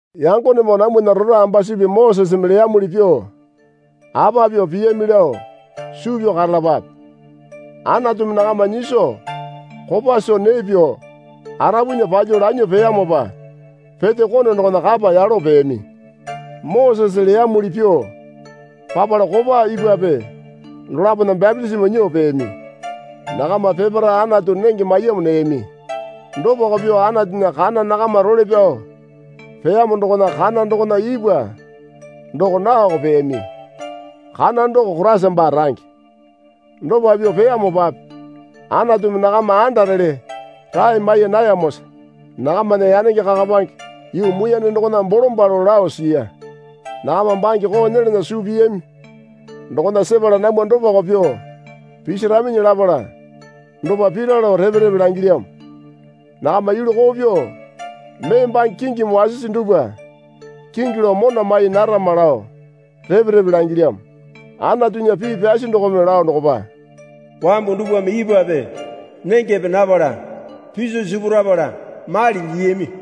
Yangonemoo namwana rora ambasupi Mosese leyamuli pyuo apa pyuo piyami lao suu pyao karalapape. Anatumi nakama nyiso kopa soo nee pyuo arapunya palyuo lanyuo peyamopa Pete Kone dokona kapa yalo peyami. Mosese leyamuli pyuo papala kopa ipwape dolapona bapitisimo nyuo peyami. Nakama peparae Anatu nenge maiyamo neyami. Dopako pyuo Anatunya kana nakama role pyao peyamo dokona kana dokona ipwa doko naoko peyami. Kana doko Koraisa baa range. Dopa pyuo piyamopape Anatumi nakama andarele rae mai nayamosa nakamana yanenge kakapange yuu muiyane dokona bolombalo lao siya. Nakama bange koo nyelana suu piyami dokona sepala namwa dopako pyuo pisaraminyi lapala dopa pira lao repe repe langilyamo. Nakama yulu koo pyuo mee bange kingimi wasisi dupwa kingi lao mona mai narama lao repe repe langilyamo. Anatunya pii pyasi dokome lao dokopa, Wambu dupwame ipwape nengepe napala piso sipurapala mali lyiyami.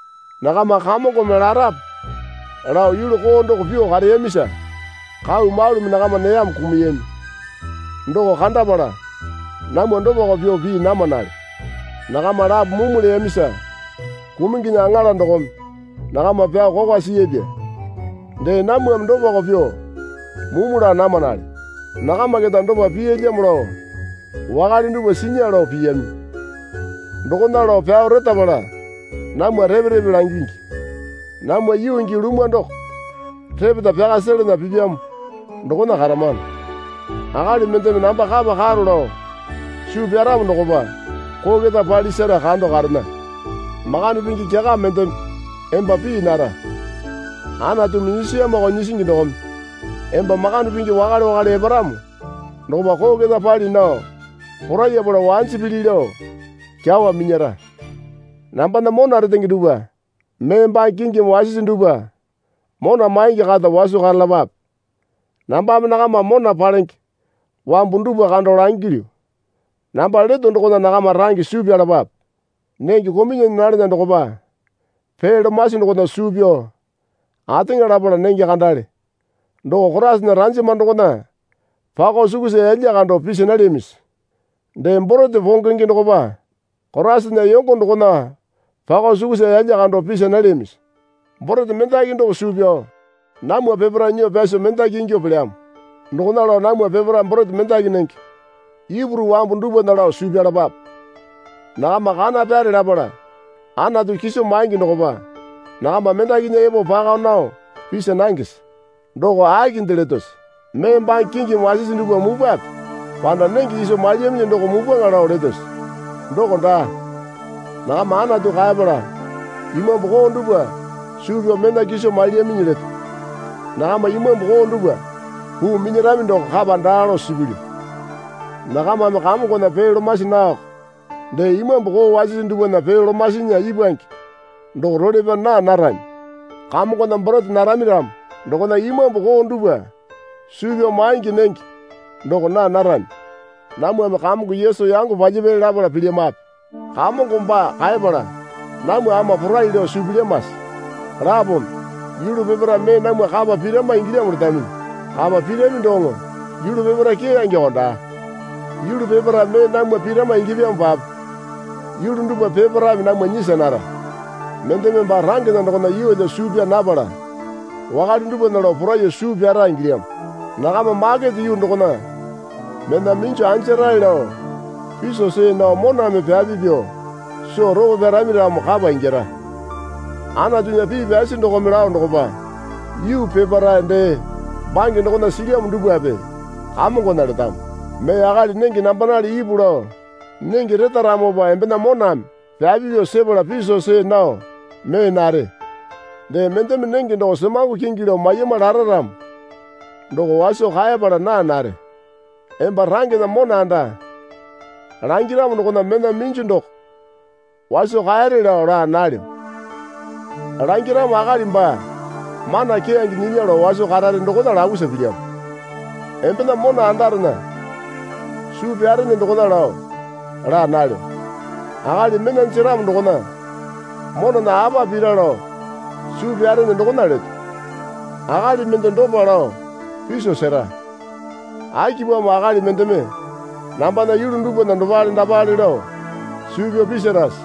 Nakama Kamongome larape lao yulu koo doko pyuo kareyamisa kau malumi nakama neyamo kumuyami. Doko kandapala namwa dopako pyuo pii namanale. Nakama lapo mumu leyamisa Kumunginya Aŋala dokome nakama pyao kokwa siyapya. Dee namwame dopako pyuo mumu laa namanale. Nakama keta dopa piyalyamo lao wakale dupwa sinya lao piyami. Dokona lao pyao retapala namwa repe repe langingi. Namwa yuu gii lumwa doko repeta pyaka selena pipyamo dokona karamano. Akali mendeme namba kapa karo lao suu pyaramo dokopa koo keta pali sera kando karena. Makande pingi kyaka mendeme emba pii nara. Anatumi nyisiyamoko nyisingi dokome emba makande pingi wakale wakale eparamo dokopa koo keta pali nao porayapala wanji pili lao kyawa minyara. Nambana mona retenge dupwa, mee bange kingimi wasisi dupwa mona maingi kata waso karalapape. Nambame nakama mona palenge wambu dupwa kando langilyu. Namba leto dokona nakama range suu pyalapape. Nenge kamyunyane nalana dokopa pee lomasi dokona suu pyao ateŋa lapala nenge kandale doko Koraisana ranjama dokona pako sukusa yalya kando pisa nalyamisi? Dee borete pongenge dokopa Koraisana yongo dokona pako sukusa yalya kando pisa nalyamisi? Borete mendaki doko suu pyao namwa peparae nyuo pyaso mendaki ingyuo pelyamo. Dokona lao namwa peparae borete mendaki nenge. Ipuru wambu dupwana lao suu pyalapape. Nakama kana pyare lapala Anatu kiso maingi dokopa nakama mendakinya epo pako nao pisa nangese? Doko akinde letose? Mee bange kingimi wasisi dupwa mupwape? Panda nenge kiso mailyaminyi doko mupwaŋa lao letose? Doko daa. Nakama Anatu kaepala imambu koo dupwa suu pyao mena kiso mailyaminyi leto. Nakama imambu koo dupwa puu minyarami doko kapa daa lao suu pilyu. Nakamame Kamongona pee lomasi naoko dee imambu koo wasisi dupwana pee lomasinya ipwange doko role pyao naa narami. Kamongona borete narami ramo dokona imambu koo dupwa suu pyao maingi nenge doko naa narami. Namwame Kamongo Yesu yango palyapyali lapala pilyamape? Kamongo baa kaepala namwa ama porai lao suu pilyamase? Lapome, Yulu peparae mee namwa kapa pirama ingilyamo letaminyi. Kapa pirami doŋo yulu peparae keyangeko daa. Yulu peparae mee namwa pirama ingyapyamopape yulu dupwa peparaeme namwa nyisa nara. Mendeme baa rangena dokona yeelyo suu pyaa napala wakale dupwana lao poraiyuo suu pyara ingilyamo. Nakama makete yuu dokona mena minju anjarae lao piso see nao moname pyapi pyuo soo ropo pyarami ramo kapa ingyara. Anatunya pii pyasi dokome lao dokopa, Yuu peparae dee bange dokona silyamo dupwape Kamongona letamo. Mee akali nenge nambanale ipu lao nenge retaramopa embena moname pyapi pyuo sepala piso see nao mee nare. Dee mendeme nenge doko semango kingi lao maiyama lara ramo doko waso kaepala naa nare. Emba rangena mona anda langiramo dokona mena minju doko waso kaere lao laa nalyo. Langiramo akali baa mana keyange nyinya lao waso karare dokona lapusa pilyamo. Embena mona andarena suu pyarene dokona lao laa nalyo. Akali mena jeramo dokona monana apa pira lao suu pyarene dokona leto. Akali mende dopa lao piso sera. Akipamo akali mendeme nambana yulu dupwana dopale dapale lao suu pyao pisirase?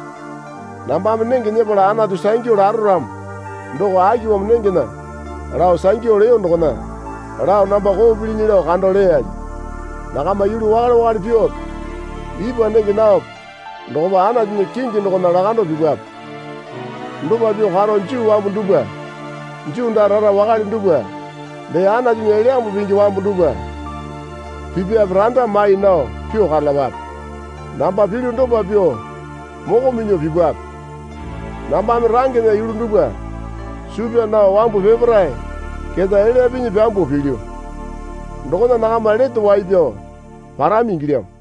Nambame nenge nyepala Anatu sangyu laro ramo doko akipamo nengena lao sangyu leyo dokona lao namba koo pilinyi lao kando leyali? Nakama yulu wakale wakale pyuope ipwa nenge naope dokopa Anatunya kingi dokona lakando pipwape. Dopa pyuo karo Juu wambu dupwa Juu daa rara wakale dupwa dee Anatunya Elyambu Pingi wambu dupwa pipape randa mai nao pyuo karalapape. Namba pilyu dopa pyuo moko minyuo pipwape. Nambame rangena yulu dupwa suu pyaa nao wambu peparae keta elya pinyi pyambuo pilyu. Dokona nakama lete wai pyao parami ingilyamo.